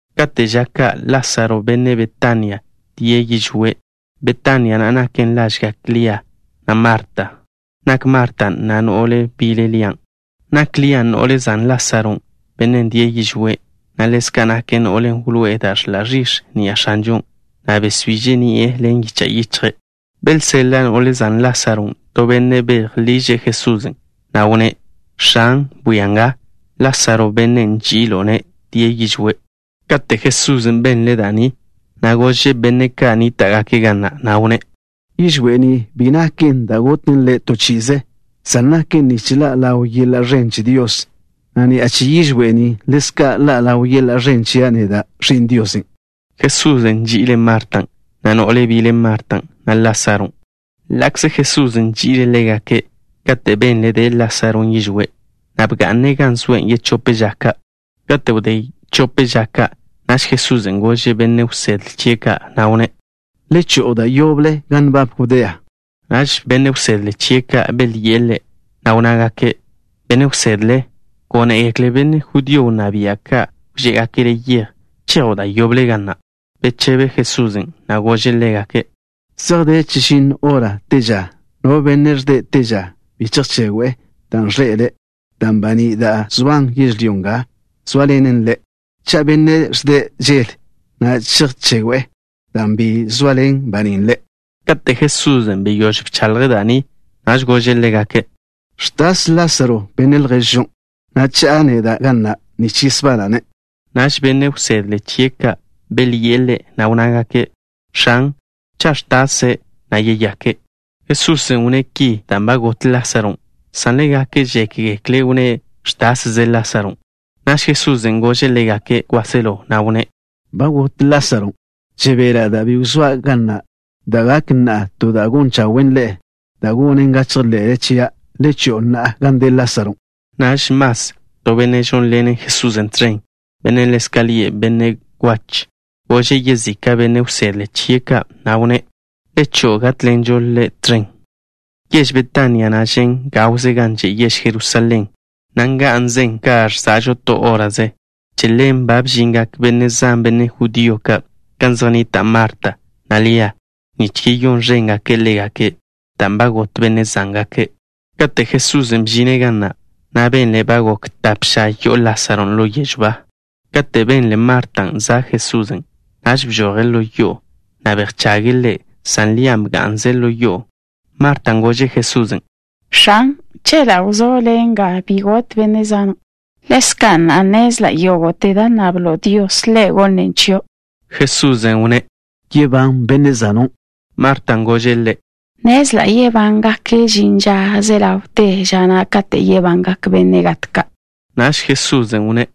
Kate' ža ka' Lásaro, benne' Betania, die' yižwé'. Betania na' naken lažgak Lia, na' Marta. Nak Marta na' no'le bile Lian'. Nak Lian' no'le zan Lásaron', bennen' die' yižwé', na' ḻezka' nake' no'len' wloé'e da' ẕḻa' ẕix̱ ni'a X̱anžon', na' besbiže' ni'e ḻen yicha' yichje'. Belseḻa' no'le zan Lásaron' to benne' bejliže' Jesusen', na' wnné': —X̱an, bwia nga, Lásaro, bennen' nži'ilo'-ne', die' yižwé'. Kate' Jesusen' benle' da' ni, gože' benne' ka' nníta'ḻengake' Ḻe', na' wnné': —Yižwé' ni bi naken da' goten ḻe' to chi'ize, san naken nich ḻa' ḻaw yeḻa' ẕen che Dios, na' ni'a che yižwé' ni ḻezka' ḻa' ḻaw yeḻa' ẕen chia' neda', Ẕi'n Diosen'. Jesusen' nži'ile' Martan', na' no'le bile Martan', na' Lásaron'. Ḻa'kze Jesusen' nži'ile' ḻégake', kate' benle' de' Lásaron' yižwé', bga'ne' gan zoe' yechóp ža ka'. Wdé chope ža ka', Jesusen' gože' benne' wsedle chie' ka', na' wnné': —Le cho'o da' yoble gan nbab Judea. Naž benne' wsedle chie' ka' belyi'e Ḻe', na' wnnágake': —Benne' Wsedle, gónegekle benne' judío wnná bia' ka' wžé'egake' Le' yej. ¿Chejo' da' yoble ga na'? Bechebe Jesusen', na' gože' ḻégake': —Zej de chežinno hora te ža. No benne' ẕde' te ža, bi chejchegwe', dan' ẕḻe'ele', dan' baní' da' zoan yežlyó nga zóaḻenen ḻe'. Cha' bennen' ẕde' žel, na' chejchegwe', dan' bi zoaḻen banín' ḻe'. Kate' Jesusen' beyóž bchaḻje' da' ni, naž gože' ḻégake': —Ẕtas Lásaro, benne' lježžon', na' cha'a neda' ga na' nich yesbana'-ne'. Naž benne' wsedle chie' ka' belyi'e Ḻe', na' wnnágake': —X̱an, cha' ẕtase', yeyake'. Jesusen' wnné' ki dan' ba got Lásaron', san ḻégake' žékgekle' wnné': “Ẕtasze Lásaron'.” Naž Jesusen' gože' ḻégake' kwáselo, na' wnné': —Ba got Lásaron'. Žebela' dan' bi wzóa' ga na', dan' gak na'a to da' gon chawen' ḻe'e, dan' gonen ga chejḻe'le chia'. Le cho'o na'a gan de Lásaron'. Naž Mas, to benne' žónḻene' Jesusen' tẕen, bennen' ḻezka' lie' Benne' Kwach, gože' yezika' benne' wsedle chie' ka', na' wnné': —Le cho'o, gátḻenžo Ḻe' tẕen. Yež Betania na' žen' gawze gan že' yež Jerusalén, na' nga'nzen ka ẕza'žo to hóraze. Che ḻen ba bžingak benne' zan, benne' judío ka', gan zej nnita' Marta, na' Lia, nich yeyón ẕéngake' ḻégake', dan' ba got benne' zángake'. Kate' Jesusen' bžine' ga na', benle' ba gok tape ža yo'o Lásaron' ḻo yežw ba. Katen' benle Martan' za' Jesusen', naž bžoje' ḻo yo'o, na' bejchage' Ḻe', san Lian' bga'nze' ḻo yo'o. Martan' gože' Jesusen': —X̱an, chela' wzó' Le' nga, bi got benne' zana'. Ḻezka' na'a, nnezla' yógo'te da' nnablo' Dios, Ḻe' gonnen' chio'. Jesusen' wnné': —Yebán benne' zano'. Martan' gože' Ḻe': —Nnezla' yebane' kate' žin ža ze ḻawte ža na' katen' yebangak benne' gat ka'. Naž Jesusen' wnné':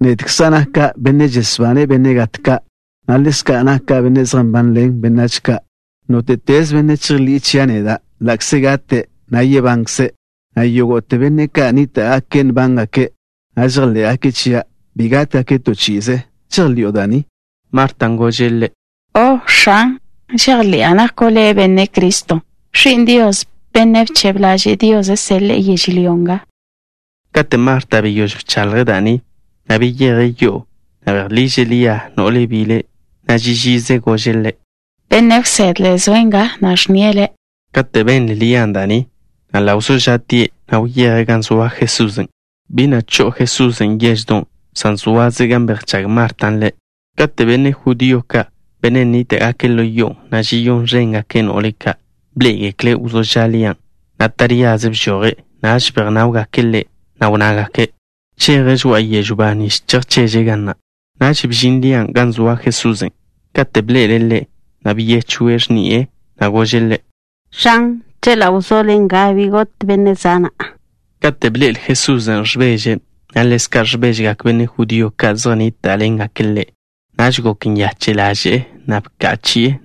—Nedkza' naka' Benne' žesbane' benne' gat ka', na' ḻezka' naka' Benne' zej nbanḻen benách ka'. Nóte'teze benne' chejḻi'e chia' neda', ḻa'kze gate', yebankze', na' yógo'te benne' ka' nníta'gake' nbángake', na' žejḻé'gake' chia', bi gátgake' to chi'ize. ¿Žejḻi'o da' ni? Martan' gože' Ḻe': —O', X̱an. Žejḻi'a nako' Le' Benne' Criston', Ẕi'n Dios, Bennen' bchebe ḻaže' Dios seḻe'e yežlyó nga. Kate' Marta beyóž bchaḻje' da' ni, beyeje' yo'o, na' bejliže' Lia, no'le bile', na' ži žize gože' ḻe': —Benne' Wsedle zoe' nga, na' ẕnnie' le'. Kate' benle Lian' da' ni, ḻa' wzó ža'tie', na' wyeje' gan zoa Jesusen'. Bi na' cho'o Jesusen' yeždon', san zoaze' gan bejchág Martan' Ḻe'. Kate' benne' judío ka', benne' nníta'gake' ḻo yo'on', na' žeyón ẕéngake' no'le ka', bḻé'egekle' wzó ža' Lian', na' taríaze bžoje', naž bejnáwgake' ḻe', na' wnnágake': —Cheje' žoa'a yežw ba nich chejcheže' ga na'. Naž bžin Lian' gan zoa Jesusen'. Kate' bḻe'ele' Ḻe', byechwe' x̱ni'e, na' gože' Ḻe': —X̱an, chela' wzó' Le' nga, bi got benne' zana'. Kate' bḻe'el Jesusen' ẕbeže', na' ḻezka' ẕbéžegak benne' judío ka' zej nníta'ḻengake' ḻe', naž gok nyache' ḻaže'e, na' bka' chi'e,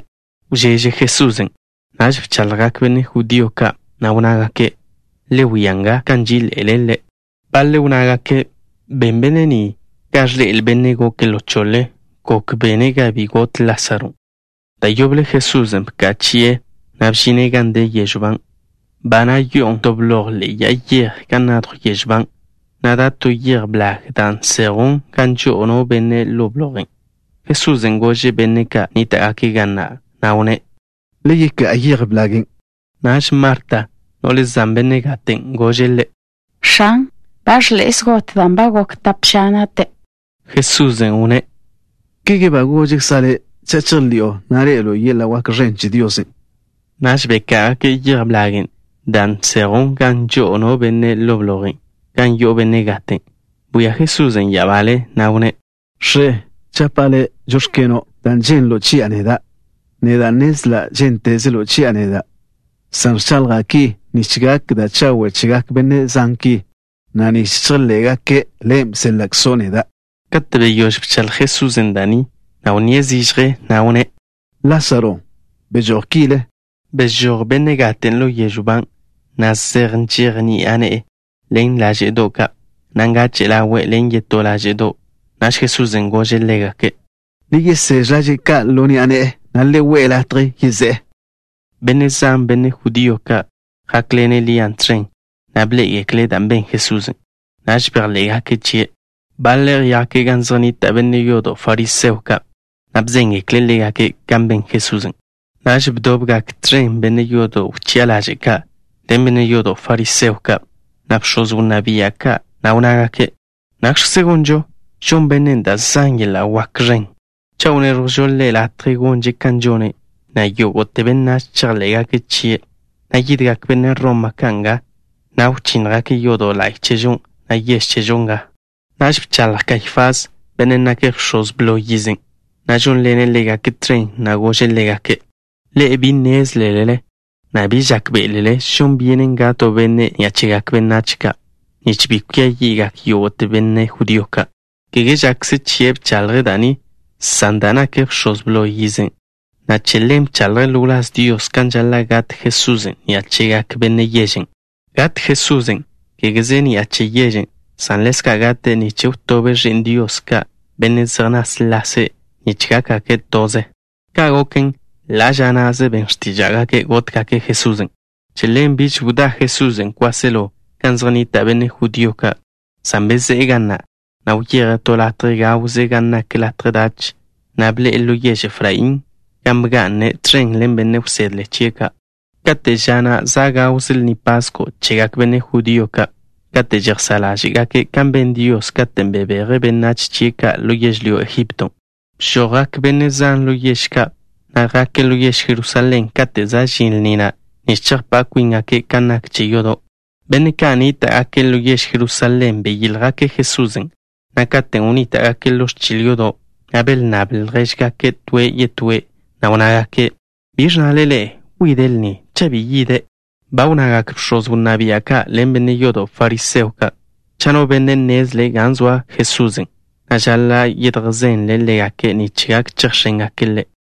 Wžeže Jesusen'. Naž bchaḻjgak benne' judío ka', na' wnnágake': —Le wia nga kan nží'iḻe'ele' ḻe'. Baḻe' wnnágake': —Ben Benne' ni ga ẕḻe'el bennen' goke' ḻo choḻe. ¿Gok bene' ga bi got Lásaron'? Da' yoble Jesusen' bka' chi'e, na' bžine' gan de yežw ban'. Ba na' yo'on to bloj ḻe'e ya'a yej gan nadjw yežw ban', na' da' to yej blag da' nsejwn gan žo'o no benne' ḻo blojen'. Jesusen' gože' benne' ka' nníta'gake' ga na', na' wnné': —Le yeká'a yej blagen'. Naž Marta, no'le zan benne' gaten', gože' Ḻe': —X̱an, ba ẕḻe'e zgot dan' ba gok tap ža nate'. Jesusen' wnné': —¿Kege gožkza' le' cha' žejḻi'o, ḻe'elo' yeḻa' wak ẕen che Dios? Naž beká'agake' yej blagen' da' nsejwn gan žo'o no benne' ḻo blojen' gan yo'o benne' gaten'. Bwia Jesusen' ya'abale, na' wnné': —X̱e, žapa' Le': “Žóx̱keno'” dan' ženlo' chia' neda'. Neda' nnezla' žéntezelo' chia' neda', san ẕchaḻja' ki nich gak da' chawe' chegak benne' zan ki, na' nich chejḻé'gake' Le' bséḻa'kzo' neda'. Kate' beyóž bchaḻj Jesusen' da' ni, wnníe' zižje, na' wnné': —Lásaro, bežój kile. Bežój benne' gaten' ḻo yežw ban', zej nžej ni'a ne'e ḻen láže'do' ka', na' ngache' ḻawe' ḻen yetó láže'do'. Naž Jesusen' gože' ḻégake': —Le yeséž laže' ka' ḻo ni'a ne'e, na' le we' latje yezé'e. Benne' zan, benne' judío ka', jákḻene' Lia tẕen, na' bḻé'egekle' dan' ben Jesusen'. Naž bejḻé'gake' chie'. Baḻe' jake' gan zej nnita' benne' yodo' fariseo ka', na' bzéngekle' ḻégake' kan ben Jesusen'. Naž bdobgak tẕen benne' yodo' wchi'a ḻaže' ka' ḻen benne' yodo' fariseo ka', na' bx̱oz wnná bia' ka', na' wnnágake': —¿Nakx̱kze gonžo? Žon bennen' da' zan yeḻa' wak ẕen. Cha' wnéẕjwžo Ḻe' latje gonže' kan žone', yógo'te benách chejḻé'gake' chie', na' yídegak benne' Roma ka' nga, na' wchínnjgake' yodo' la'y chežo, na' yež chežo nga. Naž bchaḻj Kaifás, bennen' nake' bx̱oz blo yizen', na' žónḻene' ḻégake' tẕen, na' gože' ḻégake': —Ḻe'e bi be nnézlele, na' bi žákbe'elele žon byenen gat to benne' ni'a chegak benách ka', nich bi kwia yi'gak yógo'te benne' judío ka'. Kege žakze chie' bchaḻje' da' ni, san dan' nake' bx̱oz blo yizen', che ḻen bchaḻje' ḻo wláz Dios kan žaḻa' gat Jesusen' ni'a chegak benne' yežen'. Gat Jesusen', kégeze ni'a che yežen', san ḻezka' gate' nich wtobe' ẕi'n Dios ka', benne' zej náslase', nich gákgake' toze. Ka' goken, ḻa' ža na'ze ben x̱tíža'gake' gótgake' Jesusen'. Che ḻen biž wdá Jesusen' kwáselo gan zej nnita' benne' judío ka', san bezé'e ga na', na' wyeje' to latje gawze gan nak latje dach, na' bḻe'e ḻo yež Efraín, gan bga'ne' tẕen ḻen benne' wsedle chie' ka'. Kate' ža na' za' gawze Lni Pasko' chegak benne' judío ka' kate' žejsá' ḻáže'gake' kan ben Dios katen' bebeje' benách chie' ka' ḻo yežlyó Egipto. Bžojgak benne' zan ḻo yež ka', na' jake' ḻo yež Jerusalén kate' za' žin lni na', nich chejpá' kwíngake' kan nak che yodo'. Benne' ka' nníta'gake' ḻo yež Jerusalén beyíljgake' Jesusen', na' katen' wnníta'gake' ḻo ẕchil yodo', belnnable' ljéžgake' toe' yetóe', na' wnnágake': —¿Biẕ ẕnnale ḻe'e? ¿Wide' lni, cha' bi yide'? Ba wnnagak bx̱oz wnná bia' ka' ḻen benne' yodo' fariseo ka', cha' no benne' nnezle' gan zoa Jesusen', žaḻa' yedjzenle' ḻégake' nich gak chejx̱éngake' Ḻe'.